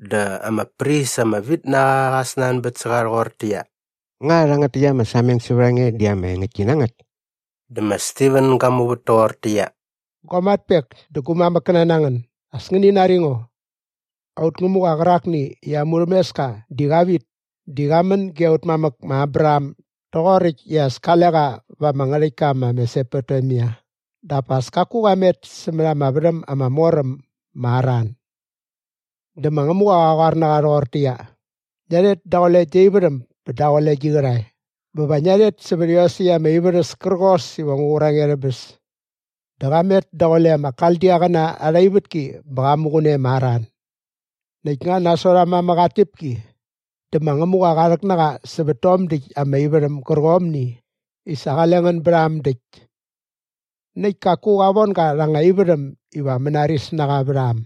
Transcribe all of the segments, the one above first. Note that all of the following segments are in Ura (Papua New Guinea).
Dä ama pris ama vit na qa qa snanbät sä qa rhoqortäqyia, “Nga rhangät täkt ama sameng sävät a nge di ama engäktki na ngät?” Dä ma Stiven ga muvät toqortäqyia “Gua matpek dä gu mamäkkäna na ngän, as ngäni nari ngo! Aut Ngämuqa qärakni i aa murhämeska di qa vit di qa män ge aut mamäk ma Abraham doqoräkt i as kale qa va ama ngärhäktka ma Mesopotemia dap as kaku qa met sämät ama värhäm ama mor äm ma Haran. Dä ma Ngämuqa qa qoar na qa rhoqortäqyia, ‘Ngia rhet daqule gia ivärhäm bä daqule gi qärhae bä va ngia rhet sävät iosäkt ama ivärhäs kärqos iva ngu qur a nge rhä bäs.’ Dä qa met daqule ama Kaldiaqäna arha ivätki bä qa muqun e ma Haran. “Näkt nga nasot aa mamäk aa tñäpki dä ma Ngämuqa qa rhäk na qa sävät tom däkt ama ivärhäm gärqomni i sa qale ngän bät a äm däkt. Näkt kaku qa von ga rha anga ivärhäm iva mänaris na qa vät a äm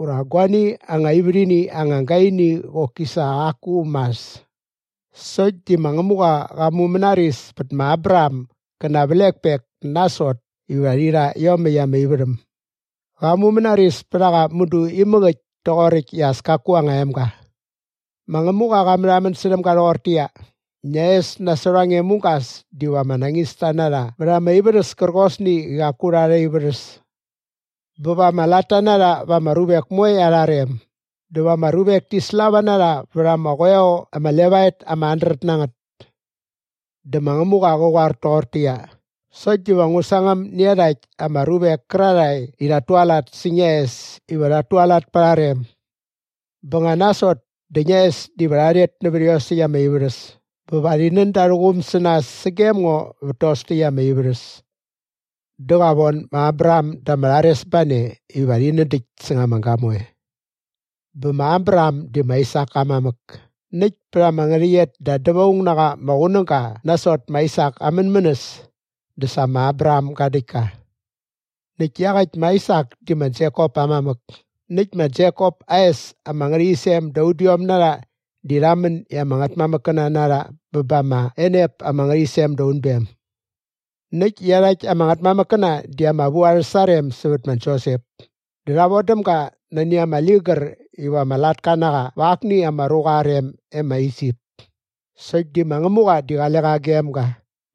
ura guani anga ivärhini anga gaini qoki sa qaku mas. Sokt di ma Ngämuqa qa mumänaris pät ma Abraham gä na aa vlekpek nasot iva rhi rha iomäkt ama ivärhäm. Qa mumänaris pät a qa mudu imäk äkt toqoräkt i as kaku aa anga emga. Ma Ngämuqa qa märhamän särhäm ga rhoqortäqyia, ‘Ngia es nasot a nge mugas diva ama nañista na rha vät ama ivärhäs kärqosni i qaku rha arha ivärhäs. Bä va ama latta na rha va ama ruvek moe arha rem dä va ama ruvek ti slava na rha vät ama qoeo ama levaet ama handret na ngät.’ Dä ma Ngämuqa qä qoar toqortäqyia, ‘Sokt diva ngu sangäm nä iarhakt ama ruvek kärarhae i rhat tualat sä ngia es iva rhat tualat pa arha rem. Bä nga nasot dä ngia es diva rha rhet nävät iosäkt ama ivärhäs bä va rhi nän da arhä quum sä nas sagem ngo vät tos täkt ama ivärhäs.’ “Dä qa von ma Abraham da ama rharesbane iva rhi nädäkt säng ama gamoe. Bä ma Abraham di ma Aisak aa mamäk näkt pät ama ngärhäqyet da dävaung na qa ama qunäga nasot ma Aisak aa mänmänäs dä sa ma Abraham ga däkt ka. Näkt iaqäkt ma Aisak di ma Jekop aa mamäk näkt ma Jekop aa es ama ngärhäqyisem da udiom na rha di rha män i ama ngätmamäkkäna na rha bä ba ama enep ama ngärhäqyisem da unbem. “Näkt iarhakt ama ngätmamäkkäna di ama vu arhä sarem sävät ma Josep dä rha vodäm ga nani ama ligär iva ama latka na qa va akni ama ruqa aa rem e ma Isip. Sokt di ma Ngämuqa di qale qa gem ga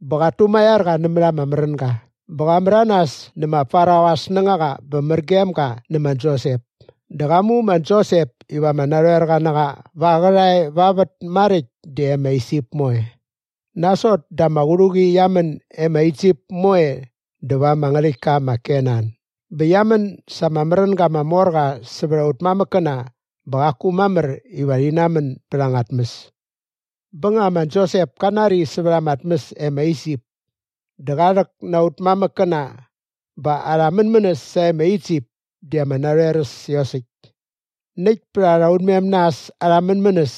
bä qat tumaiar qa nämät ama märänga bä qa märanas nä ma Farao aa snängaqa bä mär gem ga nä ma Josep dä qa mu ma Josep iva ama narhoerqa na qa va aa qärhae va vät maräkt dä e ma Isip moe. “Nasot dä ama qärhuqi qia män e ma Isip moe dä va ama ngärhäktka ma Kenan bä qia män sa ama märänga ama mor qa sävät aut mamäkkäna bä qaku mamär iva rhi namän bät anga tmäs. Bä nga ma Jekop ka nari sävät ama tmäs e ma Isip dä qa rhäk na aut mamäkkäna bä arhä mänmänäs sae ma Isip di ama narhoer äs iosäkt. Näkt pät arha unmem na äs arhä mänmänäs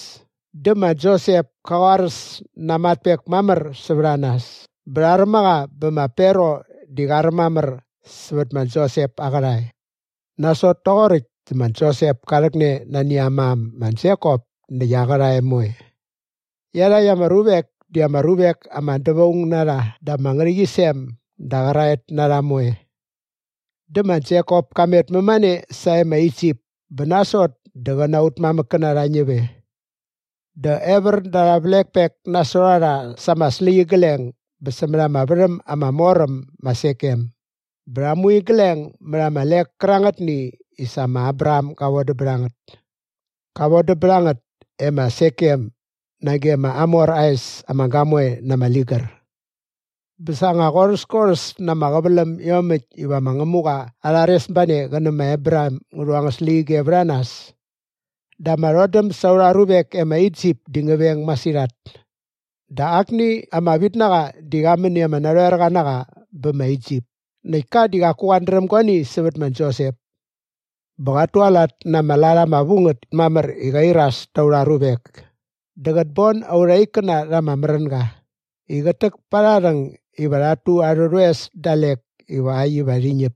dä ma Josep ka qoaräs na aa matpek mamär sävät a nas bä rha räm a qa bä ma Farao di qa räm mamär sävät ma Josep aa qärhae. “Nasot toqoräkt dä ma Josep ka rhäkne nani aa mam ma Jekop näkt aa qärhae moe. Iarhakt ama ruvek di ama ruvek ama dävaung na rha da ama ngärhäqyisem da qäraet na rha moe. Dä ma Jekop ka met mämane sae ma Isip bä nasot dä qä na aut mamäkkäna rha ñäp e. Dä evär da arha vlekpek nasot a rha sa ama släqyigleng bä sämät ama värhäm ama mor äm ma Sekem bä rha mu igleng mät ama lek kärangätni i sa ma Abraham ga vodäm bät a ngät. Qa vodäm bät a ngät e ma Sekem nage ma Hamor aa es ama gamoe na ama ligär. “Bä sa nga qorhäskorhäs na ama qäväläm iomäkt iva ma Ngämuqa aa rharesbane qä nä ma Abraham ngä rhu angät släqyige vät a nas dä ama rhodäm sa aurha ruvek e ma Isip di ngä veng masirhat. Dä akni ama vitnaqa di qa män i ama narhoerqa na qa bä ma Isip näkt ka di qaku qat dräm guani sävät ma Josep. Bä qat tualat na ama lat ama vu ngät mamär i qa iras ta aurha ruvek dä qät bon aurha ikkäna rha ama märänga i qät täk pa arha rhäng iva rhat tu arhä rhoes dalek ivakt iva rhi ñäp.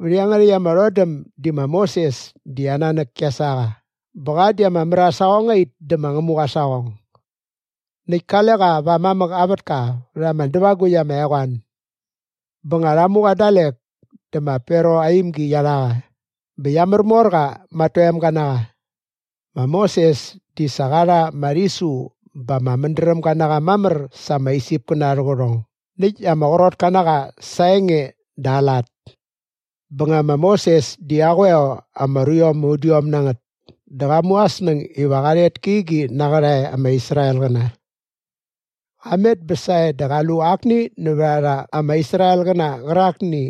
“Vät iangärhäkt ama rhodäm di ma Moses di aa nanäk kia sa qa bä qa di ama mär aa saqongait dä ma Ngämuqa aa saqong. Näkt kale qa va aa mamäk aa vätka vät ama dävagukt ama eqoan. Bä nga rha mu qa dalek dä ma Farao aa imgi qia rha qa bä qia märmor qa ma at toemga na qa. Ma Moses di sa qa rha ama rhisu bä ama mädrämga na qa mamär sa ama Isipkäna arhä qärhong näkt ama qrotka na qa sa aa enge dä aa lat. “Bä nga ma Moses di aa qoeo ama ruiom ama udiom na ngät dä qa mu aa snäng iva qa rhet kä igi na aa qärhae ama Israelqäna. Qa met bä sae dä qa lu akni nävät a rha ama Israelqäna qärakni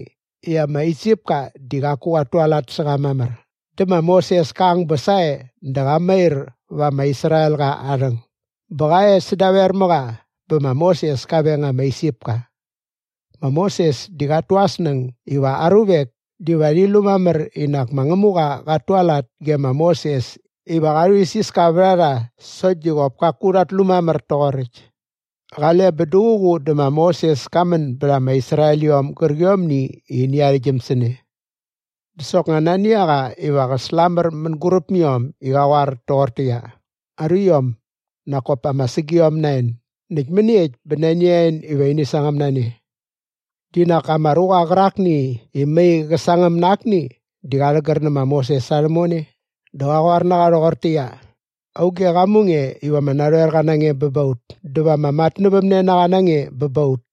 i ama Isipka di qaku qat tualat sä qa mamär dä ma Moses ka ang bä sae dä qa mair va ama Israelqa aa rhäng bä qa e sädaver mä qa bä ma Moses ka veng ama Isipka. Ma Moses di qat tu aa snäng iva aa ruvek diva rhi lu mamär i nak ma Ngämuqa qat tualat ge ma Moses iva qa rhuisiska vät a rha sokt di qop kaku rhat lu mamär toqoräkt. “Qale bä duququ dä ma Moses ka män bät ama Israeliom gärqiomni i ini arhäktgyäm sä ne. Dä soknga nani a qa iva qä slamär mänguräp mä iom i qa qoar toqortäqyia, ‘Aruiom, nak kop ama sägiom na en näkt mäniekt bä nani a en iva ini sangäm na ne?’ “Di nak ama ruqa qärakni i mai qä sangäm na akni di qa rhägär nä ma Moses sa rhämone dä qa qoar na qa rhoqortäqyia, ‘Auge qa mu nge iva ama narhoerqa na nge bä ba ut dä va ama matnävämnenaqa na nge bä ba ut?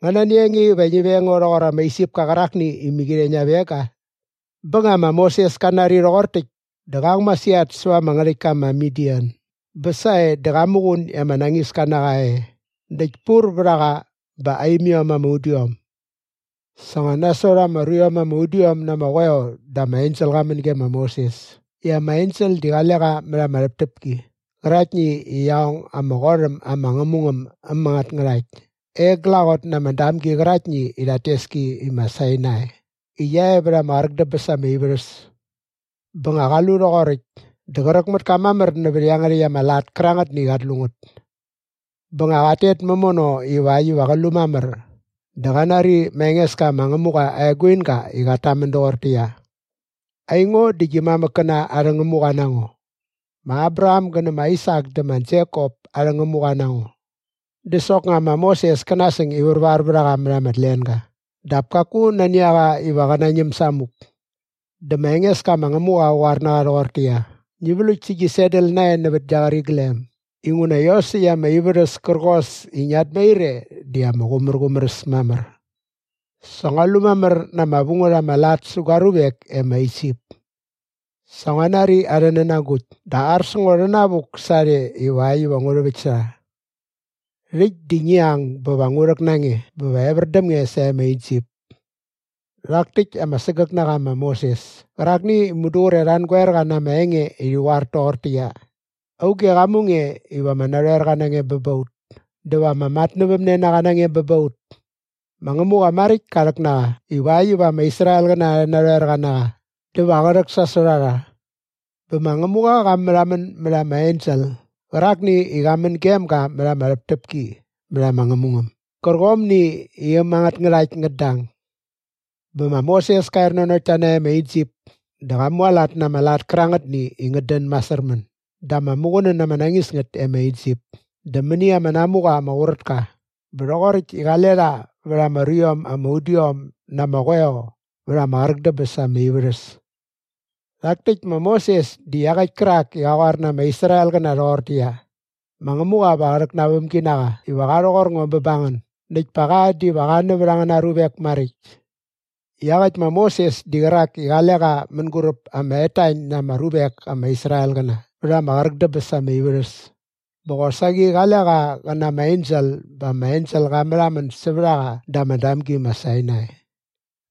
Nga nani a nge iva ngi veng ngo rhoqor ama Isipka qärakni i mäqirhe ngia veng ga?’ Bä nga ma Moses ka nari rhoqor täkt dä qa ang masirhat säva ama ngärhäktka ma Midian bä sae dä qa muqun i ama nañiska na qa e näkt pur vät a qa bä aa imiom ama udiom. “Sa nga nasot ama ruiom ama udiom na ama qoeo dä ama ensel qa män ge ma Moses i ama ensel di qale qa mät ama rhäptäpki qäraktni i qia ong ama qot äm ama ngämungäm äm angät ngärhakt e glaqot na ama damgi qäraktni i rhat tes ki i ma Sainai i qia e vät ama qräk dä bäs ama ivärhäs. Bä nga qa lu rhoqoräkt dä qräk mät ka mamär nävät iangärhäkt ama lat kärangätni i qat lu ngät. Bä nga qat tet mämono ivakt iva qä lu mamär dä qa nari ma Engeska ma Ngämuqa aa eguinga i qat tamän doqortäqyia, ‘Aingo di gi mamäkkäna arhä Ngämuqa na ngo. Ma Abraham gä nä ma Aisak dä ma Jekop arhä Ngämuqa na ngo.’ Dä soknga ma Moses kä nasäng i värvar vät a qa mät ama tlenga dap kaku nani a qa iva qä nañäm samuk. “Dä ma Engeska ma Ngämuqa qa qoar na qa rhoqortäqyia, ‘Ngi vlukt sä gi sandal nae nävät gia qäriglem inguna iosäkt ama ivärhäs kärqos i ngiat mair e di ama qumärqumär äs mamär. Sa ngua lu mamär na ama vu ngät ama lat sä gua ruvek e ma Isip. Sa ngua nari arhä nänagukt dä ar sä ngo rhänavuk sarhe ivakt iva ngu rhäväkt sä rha. Rhäkt di ngi ang bä va ngu rhäk na nge bä va evär däm nge sae ma Isip.’ “Rhak täkt ama sägäk na qa ma Moses kärakni i mudu qre rha angoer qa na ama enge i rhi qoar toqortäqyia, ‘Auge qa mu nge iva ama narhoerqa na nge bä ba ut dä va ama matnävämnenaqa na nge bä ba ut?’ Ma Ngämuqa maräkt ka rhäk na qa ivakt iva ama Israelqäna arhä narhoerqa na qa dä va qä rhäksasot a rha. Bä ma Ngämuqa qa märhamän mät ama ensel qärakni i qa män gem ga mät ama rhäptäpki vät ama ngämungäm gärqomni i äm angät ngärhakt ngät dang. “Bä ma Moses ka er nanokt ta nae ma Isip dä qa mualat na ama lat kärangätni i ngät dän masärmän dä ama muqunän ama nañis ngät e ma Isip dä mäni ama namuqa ma Qurätka bä rhoqoräkt i qale rha vät ama ruiom ama udiom na ama qoeo vät ama qräk dä bäs ama ivärhäs. Rhak täkt ma Moses di iaqäkt kärak i qa qoar na ama Israelqäna rhoqortäqyia, ‘Ma Ngämuqa va qa rhäk na aa vämginaqa iva qa rhoqor ngo bä ba ngän näkt pa qa diva qa nävät angäna ruvek maräkt.’ Iaqäkt ma Moses di qärak i qale qa mänguräp ama etañ na ama ruvek ama Israelqäna vät ama qräk dä bäs ama ivärhäs bä qosaqi qale qa qä na ama ensel bä ama ensel qa märhamän sävät a qa da ama damgi ma Sainai.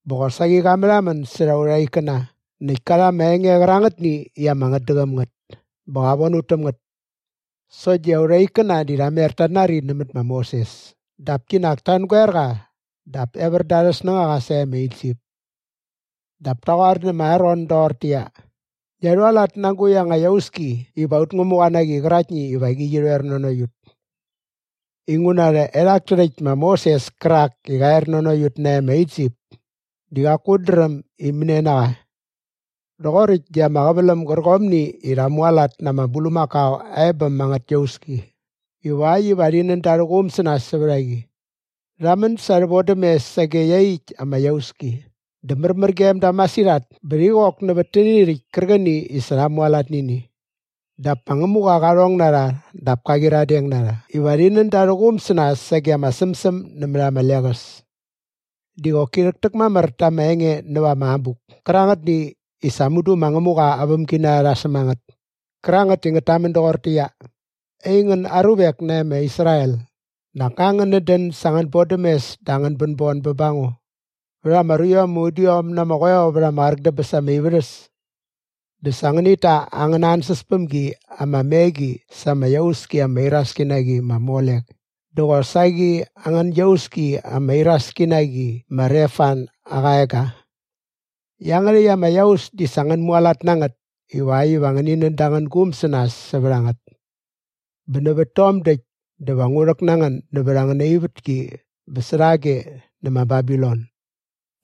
Bä qosaqi qa märhamän särha aurha ikkäna näkt ka rha ama enge qärangätni i ama ngätdäqäm ngät bä qa von ut täm ngät. Sokt di aurha ikkäna di rha mer tat nari nämät ma Moses dap kinak ta angoer qa dap evär da arhä snängaqa sae ma Isip. “Dap ta qoar nä ma Aron doqortäqyia, ‘Ngia rhualat na agukt anga iauski iva aut ngämuqa na qi qäraktni iva qi rhoer nanokt ut. Inguna rhaerhak tärhäkt ma Moses kärak i qa er nanokt ut nae ma Isip di qaku ut dräm i mänia na qa!’ Rhoqoräkt di ama qäväläm gärqomni i rha mualat na ama bulmakao aa ebäm angät iauski ivakt iva rhi nän da arhä quum sä nas sävät a qi. Rha män sa arhä vodämes sage iaqyäkt ama iauski dä märmär gem da masirhat bä rhi qok nävät täni rhäkt kärqäni i sa rha mualat nä ini. “Dap ma Ngämuqa qa rhong na rha dap ka qyiradeng na rha iva rhi nän da arhä quum sä nas sage ama sämsäm nämät ama leqäs. Di qoki rhäktäkmamär ta ama enge näva ama abuk kärangätni i sa mudu ma Ngämuqa aa vämginarha rha säm a ngät kärangät i ngät tamän doqortäqyia, “‘Aingän aruvek nae ma Israel, nak nga ngänät dän sa angän bodämes dä angän bänbon bä ba ngo vät ama ruiom ama udiom na ama qoeo vät ama qräk dä bäs ama ivärhäs? Dä sa ngänit ta angäna ansäspämgi ama me qi sa ama iauski ama iraski na qi ma Molek dä qosaqi angän iauski ama iraski na qi ma Refan aa qaega. Iangärhäkt ama iaus di sa ngän mualat na ngät ivakt iva ngäni nän da angän guum sä nas sävät a ngät. Bä nävät tom däkt dä va ngu rhäk na ngän nävät angäna ivätki bä särhage nä ma Babilon.’”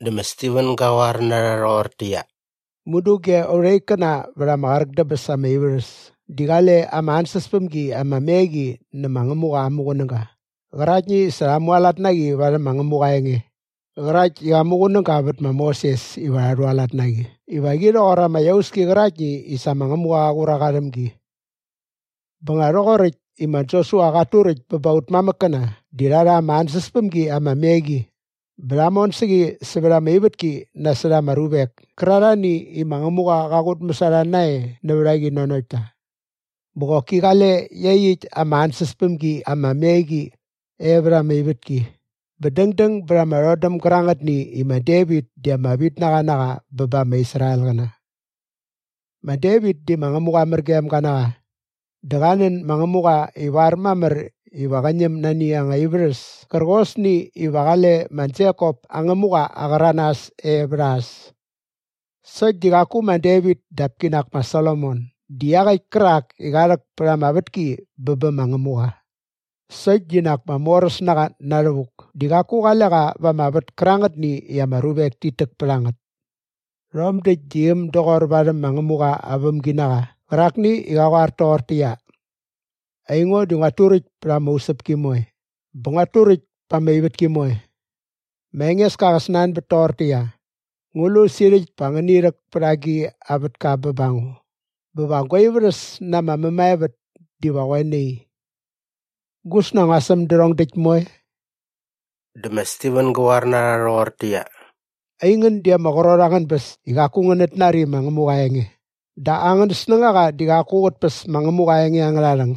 Dä ma Stiven gä qoar na rha rhoqortäqyia, “Mudu ge aurha ikkäna vät ama qräk dä bäs ama ivärhäs di qale ama ansäspämgi ama me qi nä ma Ngämuqa aa muqunäga qäraktni i sa rha mualat na qi varhäm ma Ngämuqa aa enge qärakt i qa muqunäga bät ma Moses iva rha rhualat na qi iva qi rhoqor ama iauski qäraktni i sa ma Ngämuqa qa qur a qa rhäm gi. Bä nga rhoqoräkt i ma Josua qat turäkt bä ba aut mamäkkäna di rha rha ama ansäspämgi ama me qi bä rha mon sä qi sävät ama ivätki nasot ama ruvek kärarhani i ma Ngämuqa qa qutmäs a rha nae nävät a qi nanokt ta. Bä qoki qale iaqyäkt ama ansäspämgi ama me qi e vät ama ivätki bä dängdäng bät ama rhodäm gärangätni i ma Devit di ama vitnaqa na qa bä ba ama Israelqäna. Ma Devit di ma Ngämuqa mär gem ga na qa dä qa nän ma Ngämuqa ivar mamär iva qä ñäm nani anga ivärhäs kärqosni iva qale ma Jekop aa Ngämuqa aa qäranas e vät a äs. Sokt di qaku ma Devit dap kinak ma Solomon di iaqäkt kärak i qa rhäk pät ama vätki bä bä ma Ngämuqa. “Sokt di nak ma Moräsnaqa Na Rhävuk di qaku qale qa va ama vät kärangätni i ama ruvek tit täk pät a ngät. Rhom däkt di äm doqor varhäm ma Ngämuqa aa vämginaqa qärakni i qa qoar toqortäqyia, “‘Aingo, di nguat turäkt pät ama usäpki moe bä nguat turäkt pa ama ivätki moe. Ma Engeska qä snanbät toqortäqyia, “Ngu lu sirhäkt pa ngäni rhäk pät agi a vätka bä ba ngo bä va gua ivärhäs na ama mämaevät diva qoe nai? Gusna ngua säm därhong däkt moe?”’” Dä ma Stiven gä qoar na rha rhoqortäqyia, “Aingän di ama qrot angän bäs i qaku ngänät nari ma Ngämuqa aa enge dä angän snängaqa di qaku qät päs ma Ngämuqa aa enge angärha rhäng.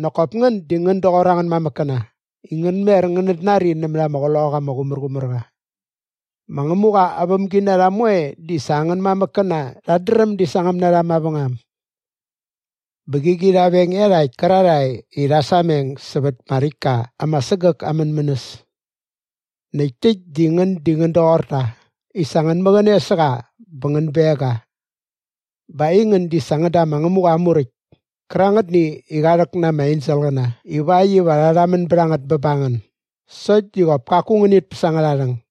Nak kop ngän di ngän doqor angän mamäkkäna i ngän mer ngänät nari nämät ama Qloqaqa ama Qumärqumärqa. Ma Ngämuqa aa vämginarha moe di sa angän mamäkkäna rhat dräm di sangäm na rha mavängam. Bä qäqi rha veng iarhakt kärarhae i rha sameng sävät ma Räktka ama Sägäk aa mänmänäs. Näkt täkt di ngän di ngän doqor ta i sa ngän mäqäne sä qa bä ngän beng ga. Bä aingän di sa ngän da ma Ngämuqa aa Muräkt kärangätni i qa rhäk na ama enselqäna ivakt iva rha rhamän bät a ngät bä ba ngän sokt di qop kaku ngänit päs angärha rhäng.”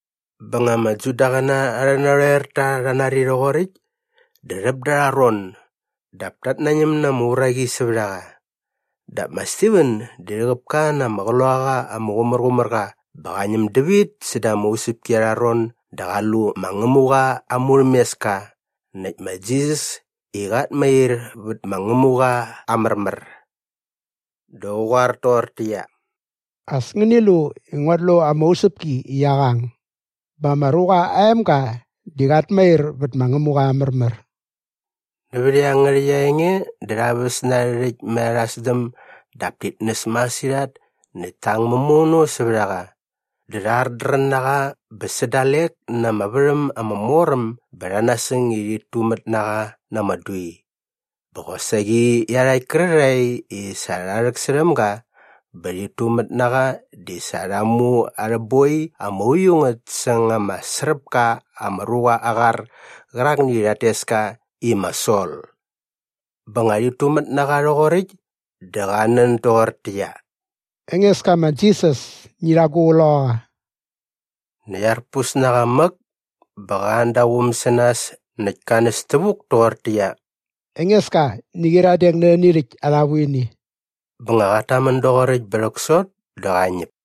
Bä nga ama Judaqäna arhä narhoerta rha nari rhoqoräkt dä rhäp dä arha ron dap tat nañäm na ama uraqi sävät a qa. Dap ma Stiven di rhäqäp ka na ama Qloqaqa ama Qumärqumärqa bä qa ñäm dävit säda ama usäpki arha ron dä qa lu ma Ngämuqa aa murhämeska näkt ma Jisas i qat mair vät ma Ngämuqa aa märmär. Dä qa qoar toqortäqyia, “As ngäni lu i nguat lu ama usäpki i qia qang bä ma Ruqa aa Emga di qat mair vät ma Ngämuqa aa märmär.” Nävät iangärhäkt aa enge dä rha väs na arhä rhäkt mät arha sdäm dap tit nästäm masirhat näkt ta ang mämono sävät a qa. Dä rha ardrän na qa bä sä dalek na ama värhäm ama mor äm bä rha nasäng i rhit tumät na qa na ama dui. Bä qosaqi iarhakt kärarhae i sa rha rhäksärhäm ga bä rhit tumät na qa di sa rha mu arhä boi ama uiu ngät säng ama sräp ka ama ruqa aa qar qärakni i rhat tes ka i ma Sol. Bä nga rhit tumät na qa rhoqoräkt dä qa nän doqortäqyia, “Engeska ma Jisas, ngi rha gu qloqaqa.” Näkt arpus na qa mäk bä qa an da aa quum sä nas näkt ka näs tävuk toqortäqyia, “Engeska, ngi qyiradeng nä rhäni rhäkt arha vuini.” Bä nga qat tamän doqoräkt bä rhäksot dä qa ñäp.